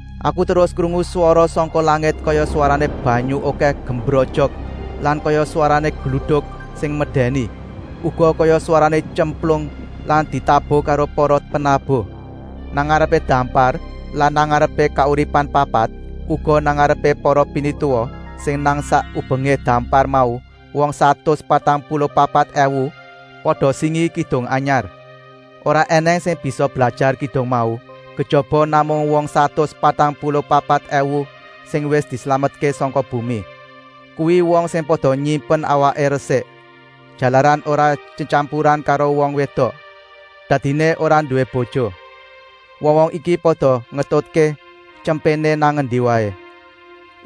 Aku terus krungu swara sangka langit kaya swarané banyu okèh gemrojok lan kaya swarané gluduk sing medèni, uga kaya swarané tyemplung sing ditabuh karo para penabuh. Nang ngarepé dampar lan nang ngarepé kauripan papat, uga nang ngarepé para pinituwa sing nang sak ubengé dampar mau wong satus patang puluh papat èwu pada singi kidung anyar. Ora ènèng sing bisa blajar kidung mau, kejaba namung wong satus patang puluh papat èwu sing wis dislametké sangka bumi. Kuwi wong sing pada nyimpen awaké resik, jalaran ora tyetyampuran karo wong wédok. Dadiné ora nduwé bojo. Wong-wong iki pada ngetutké Tyempéné nang endi waé.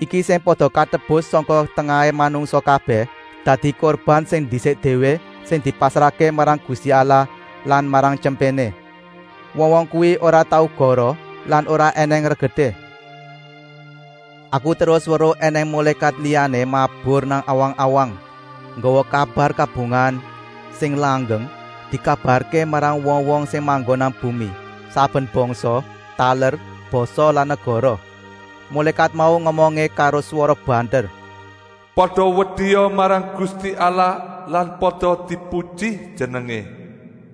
Iki sing pada katebus sangka tengahé manungsa kabèh, dadi kurban sing ndisik déwé sing dipasrahké marang Gusti Allah lan marang Tyempéné. Wong-wong kuwi ora tau goroh lan ora ènèng regeté. Aku terus weruh ènèng mulékat liyané mabur nang awang-awang, nggawa kabar kabungahan sing langgeng, dikabarké marang wong-wong sing manggon nang bumi, saben bangsa, taler, basa lan negara. Mulékat mau ngomongé karo swara banter: “Pada wedia marang Gusti Allah lan pada dipuji Jenengé,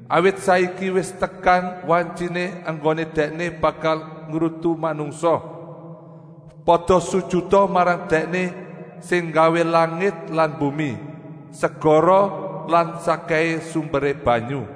awit saiki wis tekan wantyiné enggoné Dèkné bakal ngrutu manungsa. Pada sujuta marang Dèkné sing nggawé langit lan bumi, segara lan sakkèhé etuké banyu.”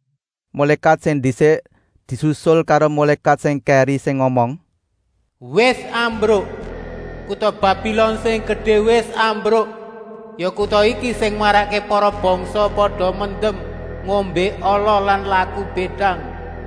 Mulékat sing ndisik disusul karo mulékat sing kèri sing ngomong: “Wis rubuh! Kuta Babilon sing gedé wis rubuh! Ya kuta iki sing marakké para bangsa pada mendem ngombé ala lan laku bédang.”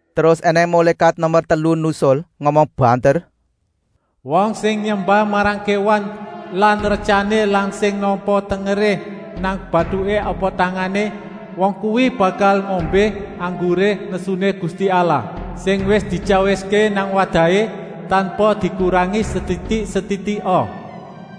Terus ènèng mulékat nomer telu nusul, ngomong banter: “Wong sing nyembah marang kéwan lan retyané lan sing nampa tengeré nang batuké apa tangané, wong kuwi bakal ngombé angguré nesuné Gusti Allah, sing wis dityawiské nang wadahé, tanpa dikurangi setitik-setitika.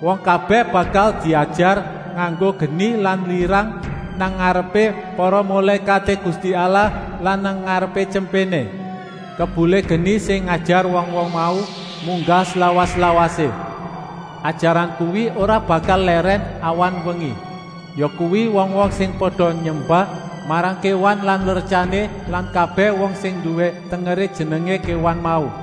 Wong kabèh bakal diajar nganggo geni lan lirang nang ngarepé para mulékaté Gusti Allah lan nang ngarepé Tyempéné. Kebulé geni sing ngajar wong-wong mau munggah slawas-lawasé. Ajaran kuwi ora bakal lèrèn awan-wengi, yakuwi wong-wong sing pada nyembah marang kéwan lan retyané lan kabèh wong sing nduwé tengeré jenengé kéwan mau.”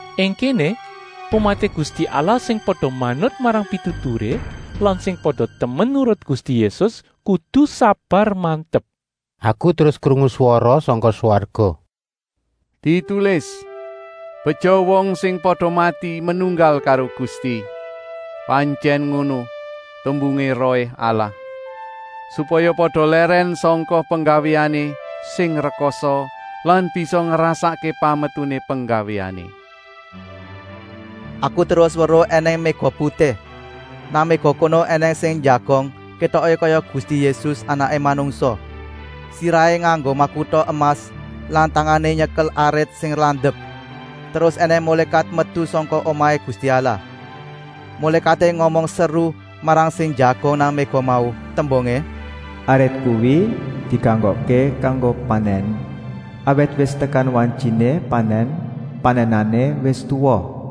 Ing kéné umaté Gusti Allah, sing pada manut marang pituturé lan sing pada temen nurut Gusti Yésus, kudu sabar-mantep. Aku terus krungu swara sangka swarga: “Ditulis: Beja wong sing pada mati menunggal karo Gusti.” “Pantyèn ngono,” tembungé Rohé Allah. “Supaya pada lèrèn sangka penggawéané sing rekasa lan bisa ngrasakké pametuné penggawéané.” Aku terus weruh ènèng méga putih. Nang méga kono ènèng sing njagong, kétoké kaya Gusti Yésus, Anaké Manungsa. Sirahé nganggo makuta emas lan tangané nyekel arit sing landep. Terus ènèng mulékat metu sangka omahé Gusti Allah. Mulékaté ngomong seru marang sing njagong nang méga mau, tembungé: “Arit kuwi dikanggokké kanggo panèn, awit wis tekan wantyiné panèn, panènané wis tuwa.”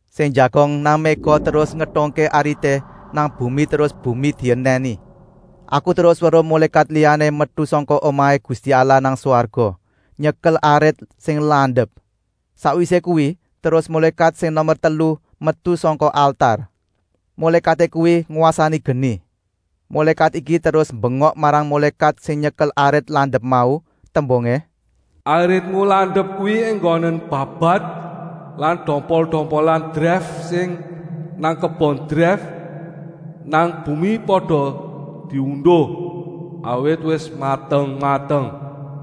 Sing njagong nang méga terus ngetungké arité nang bumi terus bumi dienèni. Aku terus weruh mulékat liyané metu sangka omahé Gusti Allah nang swarga, nyekel arit sing landep. Sakwisé kuwi terus mulékat sing nomer telu metu sangka altar. Mulékaté kuwi ngwasani geni. Mulékat iki terus mbengok marang mulékat sing nyekel arit landep mau, tembungé: “Aritmu landep kuwi enggonen babat lan dompol-dompolan dreif sing nang kebon dreif nang bumi pada diunduh, awit wis mateng-mateng!”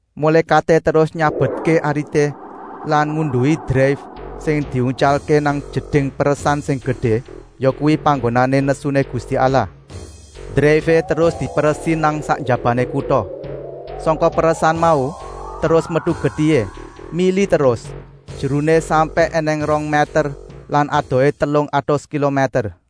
Mulékaté terus nyabetké arité lan ngunduhi dreif terus diuntyalké nang jeding peresan sing gedé, yakuwi panggonané nesuné Gusti Allah. Dreifé terus diperesi nang sak njabané kuta. Sangka peresan mau terus metu getihé, mili terus, jeruné sampèk ènèng rong mèter lan adohé telung atus kilomèter.